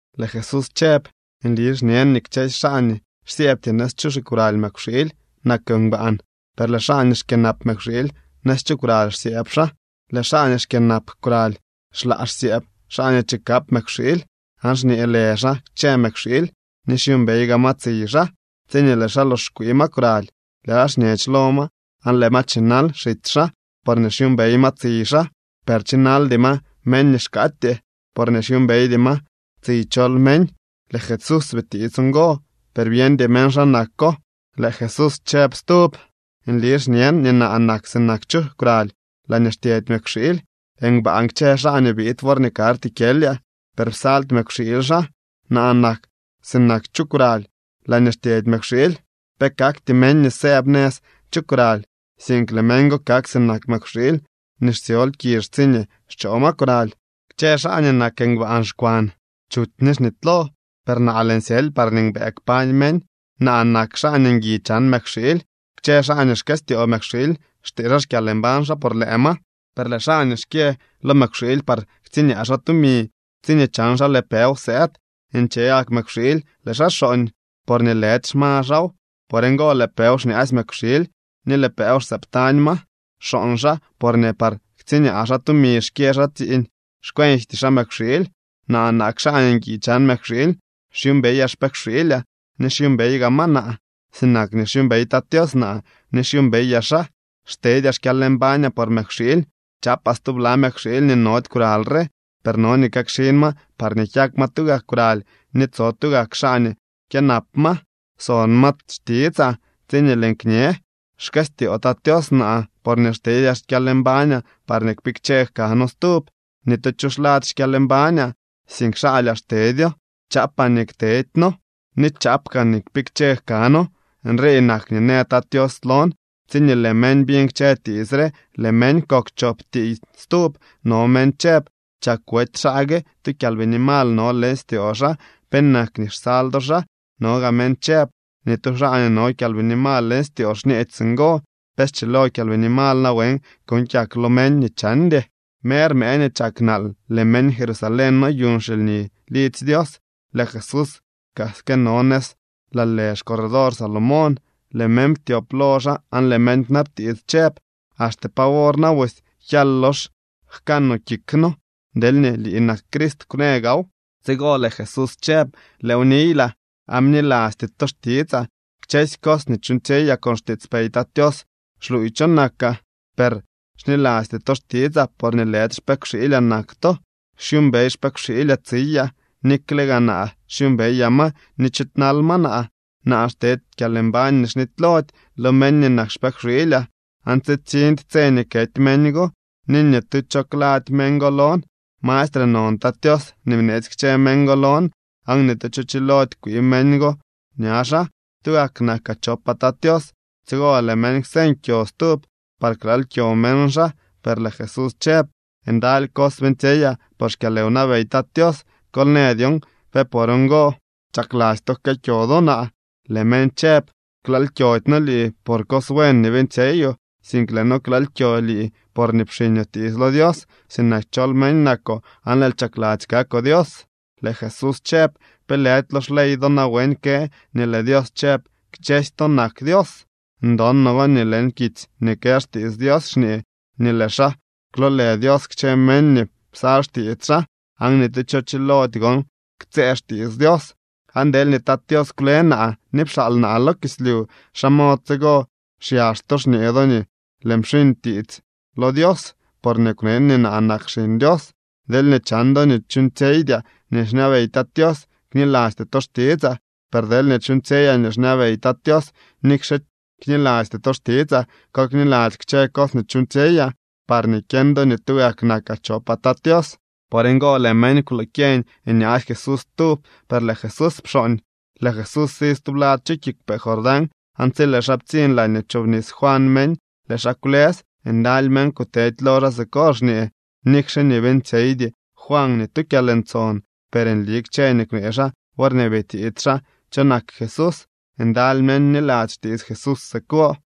Lëë Jesús chëb: —Nli xñen nii kchësy xaa nii xsyëëbty nëz chu xikwraly mëkwxiily nak ngbaan. Per lëë xaa nii xkyënap mëkwxiily nëz chu kwraly xsyëëb xaa. Lëë xaa nii xkyënap kwraly xlaa xsyëëb xaa nii chikap mëkwxiily aan xñee lë xaa kchë mëkwxiily ni xyuumbey gaa ma tsiy xaa. Tsiñee lëë xaa lox xkwii ma kwraly, lëë xaa xñech lo ma aan lëë ma chinal xitsy xaa porñee xyuumbey ma tsiy xaa. Per chinaldy ma meñ nii xkaatyee, porñee xyuumbeydy ma tsiy chol meñ. Lëë Jesús bitiits ngo, per byeñdy meñ xa nako. Lëë Jesús chëb stub: —Nli xñen nii naa nak sinak chu kwraly laañee xtyedy mëkwxiily. Ngbaan kchë xaa nii biid worñee karty kyelyaa, per psaldy mëkwxiily xaa. Naa nak sinak chu kwraly laañee xtyedy mëkwxiily. Pe kakty meñ nii sëëb nëz chu kwraly, sink lëë meñ go kak sinak mëkwxiily nii xtsyol kizh tsiñee xchoo ma kwraly. ’Kchë xaa nii nak ngbaan xkwan, chuty ni xnitylo, per naa, lëën syely parñee mbëë kpañ meñ. Naa nak xaa nii ngui chan mëkwxiily. Kchë xaa nii xkëstyoo mëkwxiily xtee xaa xkyalmbañ xaa por lëë ma, per lëë xaa nii xkyë lo mëkwxiily par ktsiñaa tumi, tsiñee chan xaa lëë pëw sëëd, nche gak mëkwxiily lëë xaa xooñ, porñee lëdy xma xaaw. Por ngo lëë pëw xñaasy mëkwxiily ni lëë pëw xsëëb tañ ma. Xooñ xaa porñee par ktsiñaa xaa tumi xkyë xaa tsiiñ, xcuenjty xaa mëkwxiily. ’Naa nak xaa nii ngui chan mëkwxiily. Xyuumbeyaa xpëkwxiilyaa ni xyuumbey gaa ma naa sinak nii xyuumbey Tat Tios naa ni xyuumbeyaa xaa. Xtedyaa xkyalmbañaa por mëkwxiily. Chaapaa stubla mëkwxiily nii nody kwraly re, per no nii kakxin ma parñee kyak ma tugak kwraly ni tso tugak xaa nii kyënap ma. Son ma xtitsaa tsi lëën kñe. ’Xkëstyoo Tat Tios naa porñee xtedyaa xkyalmbañaa parñee kpikche jkano stub. Ni tu cho xlady xkyalmbañaa, sink xaalyaa xtedyo. Chaapaa nii ktedyno ni chaap kaan nii kpikche jkano. Nrii nak nii në Tat Tios lon. Tsiñee lëë meñ biñ kchë tiits re, lëë meñ kok chop tiiy stub. No meñ chëb: —Chak wety xaa gue, tu kyalbini mal no leñ styoo xaa. ¿Penak nii xsal do xaa? No gaa meñ chëb: —Ni tu xaa nii no kyalbini mal leñ styoo xñeedy singo. ¿Pe schilo kyalbini mal nawen kuuñ kyak lo meñ nii chandy? Mer mëë nii chak nal, lëë meñ Jerusalén noyuñ xilni lidzy Dios. Lëë Jesús kaa këno nëz laa lë xcorredor Salomón. Lëë meñ ptyop lo xaa aan lëë meñ kwnabtiits chëb: —¿Axte pa wor na busy kyal lox jkanoo kik noo? Deelñee lii nak Crist, kwnë gaaw. Tsigo lëë Jesús chëb: —Lëëw niylaa aan bnilasty to xtitsaa. Kchësy cos nii chuuñtsyeyaa con xtiitspey Tat Tios xluuy cho nakaa. Per xnilasty to xtitsaa porñee lëdy xpëkwxiilyaa nak to. Xyuumbey xpëkwxiilyaa tsiyaa, nikle gaa naa xyuumbeyaa ma ni chiidnal ma naa. Naa xtedy kyalmbañ nii xnitylody lo meñ nii nak xpëkwxiilyaa, aan tsitsiñdy tse nii kety meñ go, ni ni tu cho klady meñ go lon. Mastre non Tat Tios nii bneetsy kchë meñ go lon, aan ni tu cho chilody kwii meñ go ña xaa. Tugak nakaa chopaa Tat Tios. Tsigo lëë meñ kwseñ kyo stub par klaal kyo meñ xaa. Per lëë Jesús chëb: —Ndaly cos buen beeñtsyeyaa por xkyalwnabey Tat Tios. Kol në dyon ¿pe por ngo chakladzy to jkëë kyo do naa? Lëë meñ chëb: —Klaal kyody noo lii por cos buen nii beeñtsyeyoo, sink lëë noo klaal kyo lii porñee pxiñoo tiits lo Dios. Sinak chol meñ nakoo aan lëël chakladzy kakoo Dios. Lëë Jesús chëb: —¿Pe lëdy lo xley do nawen kë nii lëë Dios chëb: “Kchësy to nak dios”? Ndon no nii leñ kitsy nii kë xtiits Dios xñee nii lëë xaa kwloolë dios kchë meñ nii psal xtiits xaa, aan ni tu cho chilody gon ktsëë xtiits Dios. Aan deelñee Tat Tios kwle naa ni pxaal naa lo kislyu, ¿xa mod tsigo xyax to xñee do nii lëën pxiñ tiits lo Dios porñee kwnen nii naa nak Xiñ Dios? Deelñee chan do nii chuuñtsyeydyaa nii xñabey Tat Tios, knilasty to xtitsaa. Per deelñee chuuñtsyeyaa nii xñabey Tat Tios, nikxe knilasty to xtitsaa, kol kniladzy kchë cos nii chuuñtsyeyaa, parñee kyeñ do nii tugak nakaa chopaa Tat Tios. Por ngo lëë meñ kwloo kyeñ nyaasy Jesús stub, per lëë Jesús pxooñ. Lëë Jesús si stublad chu kiigwpee Jordán, aan tsi lëë xaa ptsiñ laañee pchoobnis Juan meñ, lëë xaa kwlës. Ndaly meñ kutedy lo xaa siko xñee: —Nikxe nii beeñtsyeydy Juan ni tu kyalntson, per nli kchë nii kwnee xaa worñee bitiits xaa cho nak Jesús. Ndaly meñ bniladzy xtiits Jesús siko.